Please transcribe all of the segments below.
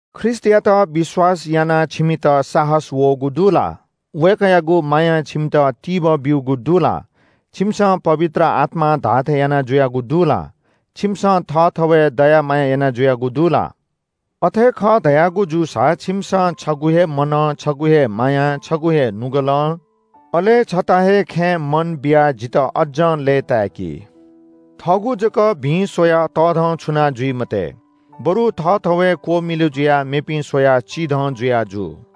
ख्रीष्‍टयात विश्‍वास यानाः छिमित साहस वःगु दु ला? वय्‌कःयागु मायां छिमित तिबः ब्‍यूगु दु ला? छिमिसं पवित्र आत्‍मां धाःथें याना जुयागु दु ला? छिमिसं थःथवय् दया माया याना जुयागु दु ला? अथे खः धयागु जूसा छिमिसं छगू हे मनं, छगू हे मायां, छगू हे नुगलं, अले छता हे खँय् मन बियाः जितः अज्‍जं लय्‌ताय्‌की। थःगु जक भिं स्‍वयाः तःधंछुना जुइ मते। बरु थःथवय् क्‍वमिलु जुयाः मेपिं स्‍वयाः चिधं जुया जु।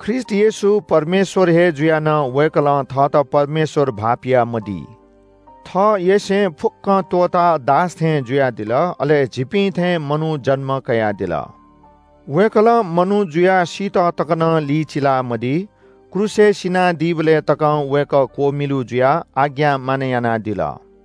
ख्रीष्‍ट येशू परमेश्‍वर हे जुयाः नं वय्‌कलं थःत परमेश्‍वर भाःपिया मदी। थःयसें फुक्‍कं त्‍वःताः दास थें जुयादिल, अले झीपिं थें मनू जन्‍म कयादिल। वय्‌कलं मनू जुयाः सीत तकं नं लिचिलामदी। क्रूसय् सिनादीबलय् तकं वय्‌कः क्‍वमिलु जुयाः आज्ञा मानय् यानादिल।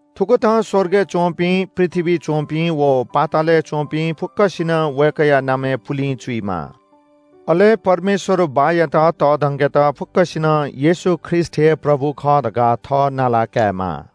थुकथं स्‍वर्गय् च्‍वंपिं, पृथ्‍वीइ च्‍वंपिं व पातालय् च्‍वंपिं फुक्‍कसिनं वय्‌कःया नामय् पुलिं चुइमाः। अले परमेश्‍वर बाःयात तःधंकेत फुक्‍कसिनं येशू ख्रीष्‍ट हे “प्रभु” खः धकाः थः नाला कायेमाः।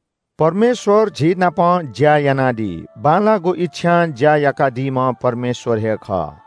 परमेश्‍वर झीनापं ज्‍या यानादी। बांलाःगु इच्‍छां ज्‍या याकादीम्‍ह परमेश्‍वर हे खः।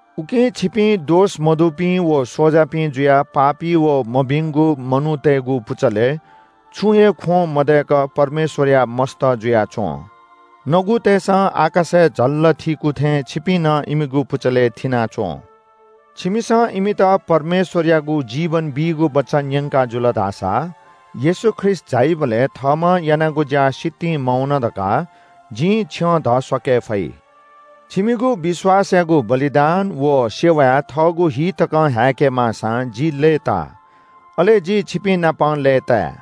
उकिं छिपिं दोष मदुपिं व स्‍वजापिं जुयाः पापी व मभिंगु मनूतय्‌गु पुचलय् छुं हे ख्‍वं मदय्‌क परमेश्‍वरया मस्‍त जुयाच्‍वँ। नगुतय्‌सं आकाशय् झल्‍ल थीकू थें छिपिं नं इमिगु पुचलय् थिना च्‍वँ। छिमिसं इमित परमेश्‍वरयागु जीवन बीगु वचन न्‍यंकाजुल धाःसा येशू ख्रीष्‍ट झाइबलय् थःम्‍हं यानागु ज्‍या सितिं मवन धकाः जिं छ्यं धस्‍वाके फइ। छिमिगु विश्‍वासयागु बलिदान व सेवाय् थःगु हि तकं हाय्‌के माःसां जि लय्‌ताः। अले जि छिपिंनापं लय्‌ताये।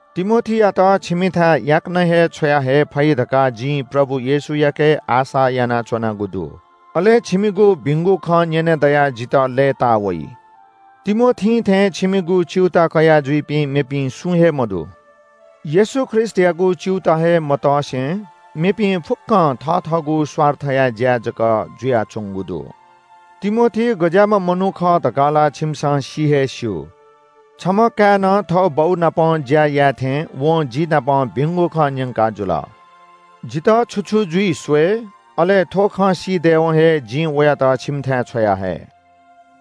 तिमोथीयात छिमिथाय् याकनं हे छ्वयाहये फइ धकाः जिं प्रभु येशूयाके आशा यानाच्‍वनागु दु। अले छिमिगु भिंगु खँ न्‍यने दयाः जितः लय्‌तावइ। तिमोथीं थें छिमिगु च्‍यूताः कयाजुइपिं मेपिं सुं हे मदु। येशू ख्रीष्‍टयागु च्‍यूताः हे मतसे मेपिं फुक्‍कं थथःगु स्‍वार्थया ज्‍याय् जक जुयाच्‍वंगु दु। तिमोथी गज्‍याःम्‍ह मनू खः धकाः ला छिमिसं सि हे स्‍यू। छम्‍ह काय्‌नं थः बौनाप ज्‍या याये थें वं जि नाप भिंगु खँ न्‍यंकाजुल। जितः छु छु जुइ स्‍वये, अले थ्‍व खँ सी दयेवं हे जिं वयात छिमिथाय् छ्वयाहये।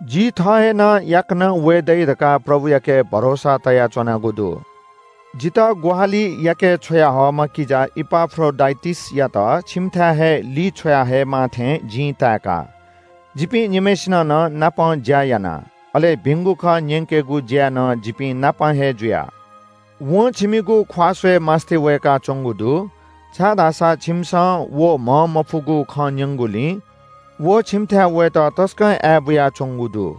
जि थः हे नं याकनं वये दइ धकाः प्रभुयाके भरोसा तयाच्‍वनागु दु। जितः ग्‍वाहालि याके छ्वयाहःम्‍ह किजा इपाफ्रोडिटसयात छिमिथाय् हे लिछ्वया हयेमाः थें जिं ताय्‌का। जिपिं निम्‍हय्‌सिनं नं नापं ज्‍या याना, अले भिंगु खँ न्‍यंकेगु ज्‍याय् नं जिपिंनापं हे जुया। वं छिमिगु ख्‍वाः स्‍वयेमास्‍ति वय्‌काच्‍वंगु दु, छाय्‌धाःसा छिमिसं व म्‍हंमफुगु खँ न्‍यंगुलिं व छिमिथाय् वयेत तसकं आय्‌बुया च्‍वंगु दु।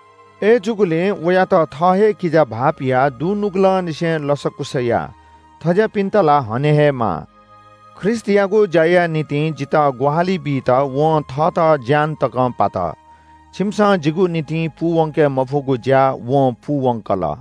अय्‌जूगुलिं वयात थः हे किजा भाःपियाः दुनुगलंनिसें लसकुस या। थज्‍याःपिन्‍त ला हने हे माः। ख्रीष्‍टयागु ज्‍याया निंतिं जितः ग्‍वाहालि बीत वं थःगु ज्‍यान तकं पात। छिमिसं जिगु निंतिं पूवंके मफुगु ज्‍या वं पूवंकल।